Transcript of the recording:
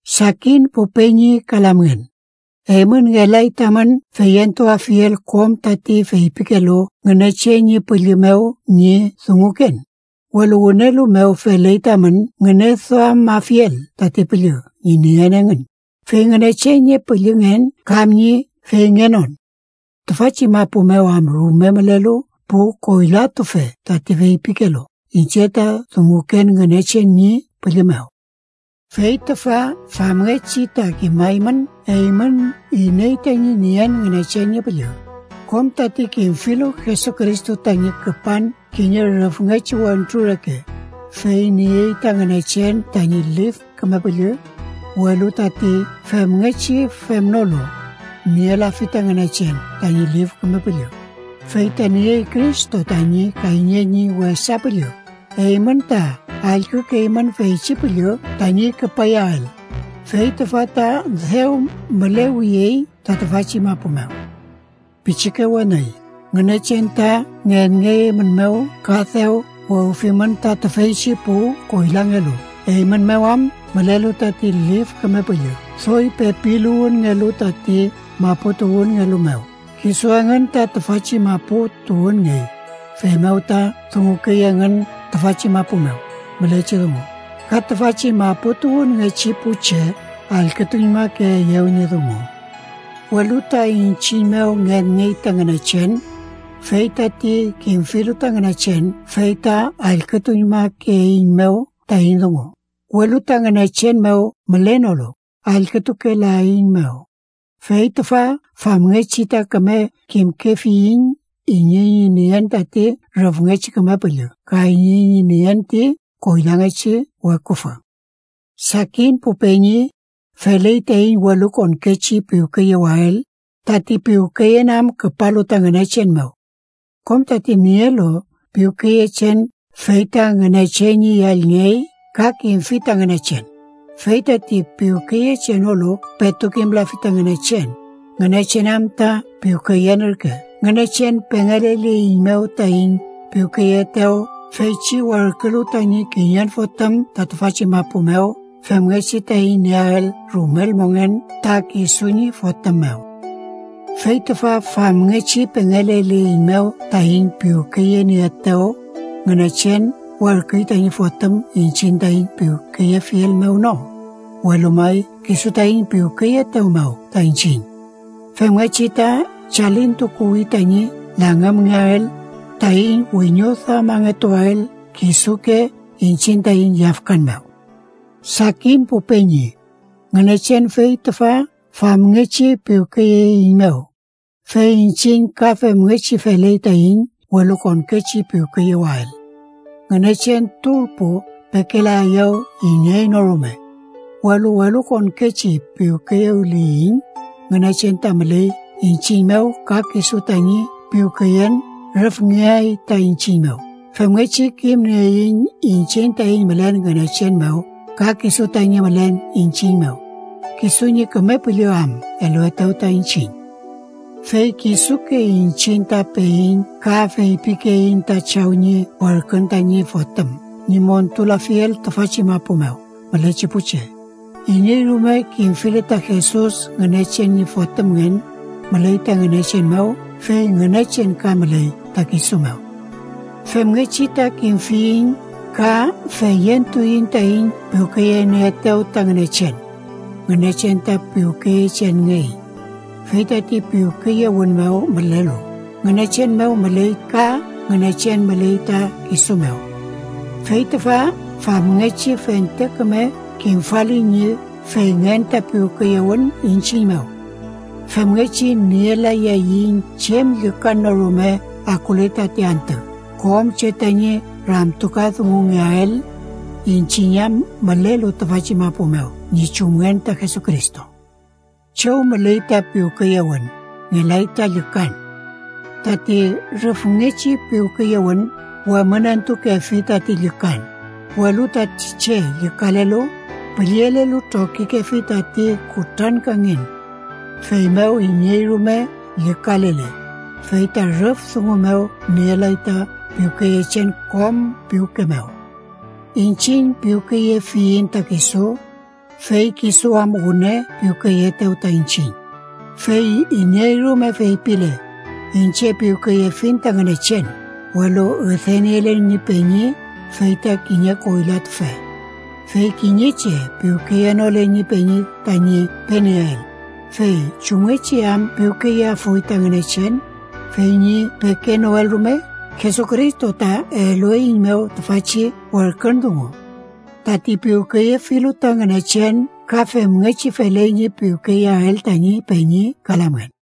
Sakin pu peñi ka lamngen, eymün ngelay tamün feyentuafiel kom tati feypikelu Ngünechen ñi Püllü mew ñi dunguken, welu wünelu mew feley tamün ngüneduamafiel tati püllü ñi nien engün, fey Ngünechen ñi püllüngen kam ñi feyngenon. Tüfachi mapu mew am rume mülelu pu koylatufe tati feypikelu iñche ta dunguken Ngünechen ñi Püllü mew. Fey tüfa famngechi ta kimaymün eymün iney tañi nien Ngünechen ñi Püllü: kom tati kimfilu Jesucristo tañi küpan kiñe rüfngechi wentru reke, fey niey ta Ngünechen tañi Lif Küme Püllü. Welu tati femngechi femnolu, nielafi ta Ngünechen tañi Lif Küme Püllü. Fey ta niey Cristo tañi kayñe ñi wesa püllü. Eymün ta allkükeymün feychi püllü tañi küpayael, fey tüfa ta dew mülewiyey ta tüfachi mapu mew. Pichike weni, Ngünechen ta ngenngey eymün mew ka dew wewfimün ta tüfeychi pu koylangelu, eymün mew am mülelu tati Lif Küme Püllü doy pepiluwünngelu tati maputuwünngelu mew. Kisu engün ta tüfachi mapu tuwünngey, feymew ta dungukey engün tüfachi mapu mew mülechi dungu, ka tüfachi maputuwünngechi pu che allkütuñmakeeyew ñi dungu. Welu ta iñchiñ mew ngenngey ta Ngünechen. Fey tati kimfilu ta Ngünechen fey ta allkütuñmakeeiñmew taiñ dungu, welu ta Ngünechen mew mülenolu, allkütukelaeiñmew. Fey tüfa famngechi ta küme kimkefiyiñ iney ñi nien tati rüfngechi Küme Püllü ka iney ñi nien ti koylangechi weküfü. Sakin pu peñi, feley taiñ welukonkechi piwkeyewael, tati piwkeyen am küpalu ta Ngünechen mew. Kom tati nielu piwkeyechen fey ta Ngünechen ñi yallngey ka kimfi ta Ngünechen. Fey tati piwkeyechenolu petu kimlafi ta Ngünechen, Ngünechen am ta piwkeyen ürke. Ngünechen pengeleleiñmew taiñ piwkeyeetew feychi werkülu tañi kiñen Fotüm ta tüfachi mapu mew femngechi taiñ nieael rumel mongen ta kisu ñi Fotüm mew. Fey tüfa famngechi pengeleleiñmew taiñ piwkeyenieetew: Ngünechen werküy tañi Fotüm iñchiñ taiñ piwkeyefiel mew no, welu may kisu taiñ piwkeyeetew mew ta iñchiñ, femngechi ta chalintukuwi tañi langümngeael, taiñ wiñoduamangetuael kisuke iñchiñ taiñ yafkan mew. Sakin pu peñi, Ngünechen fey tüfa famngechi piwkeyeeiñmew, fey iñchiñ ka femngechi feley taiñ welukonkechi piwkeyewael. Ngünechen turpu pekelaeyew iney no rume, welu welukonkechi piwkeyewliyiñ, Ngünechen ta müley iñchiñ mew ka kisu tañi piwkeyen rüfngeay ta iñchiñ mew. Femngechi kimnieiñ iñchiñ taiñ mülen Ngünechen mew ka kisu tañi mülen iñchiñ mew, kisu ñi Küme Püllü am eluetew ta iñchiñ. Fey kisuke iñchiñ ta peiñ ka feypikeiñ ta Chaw ñi werkün tañi Fotüm ñi montulafiel tüfachi mapu mew mülechi pu che. Iney rume kimfile ta Jesus Ngünechen ñi Fotümngen, müley ta Ngünechen mew fey Ngünechen ka müley ta kisu mew. Femngechi ta kimfiyiñ ka feyentuiñ taiñ piwkeyenieetew ta Ngünechen: Ngünechen ta piwkeyechenngey, fey tati piwkeyewün mew mülelu, Ngünechen mew müley ka Ngünechen müley ta kisu mew. Fey tüfa famngechi fente küme kimfali ñi feyngen ta piwkeyewün iñchiñ mew, femngechi nielayaiñ chem llükan no rume akule tati antü kom che tañi ramtukadungungeael, iñchiñ am mülelu tüfachi mapu mew ñi chumngen ta Jesucristo. Chew müley ta piwkeyewün, ngelay ta llükan. Tati rüfngechi piwkeyewün wemünentukefi tati llükan, welu tati che llükalelu, püllelelu trokikefi tati kutrankangen. Feymew, iney rume llükalele, fey ta rüf dungu mew nielay ta piwkeyechen kom piwke mew. Iñchiñ piwkeyefiyiñ ta kisu, fey kisu am wüne piwkeyeetew ta iñchiñ. Fey iney rume feypile: “Iñche piwkeyefiñ ta Ngünechen”, welu üdeniele ñi peñi, fey ta kiñe koylatufe. Fey kiñe che piwkeyenole ñi peñi tañi penieel, fey ¿chumngechi am piwkeyeafuy ta Ngünechen, fey ñi pekenoel rume? Jesucristo ta elueiñmew tüfachi werkün dungu: Tati piwkeyefilu ta Ngünechen ka femngechi feley ñi piwkeyeael tañi peñi ka lamngen.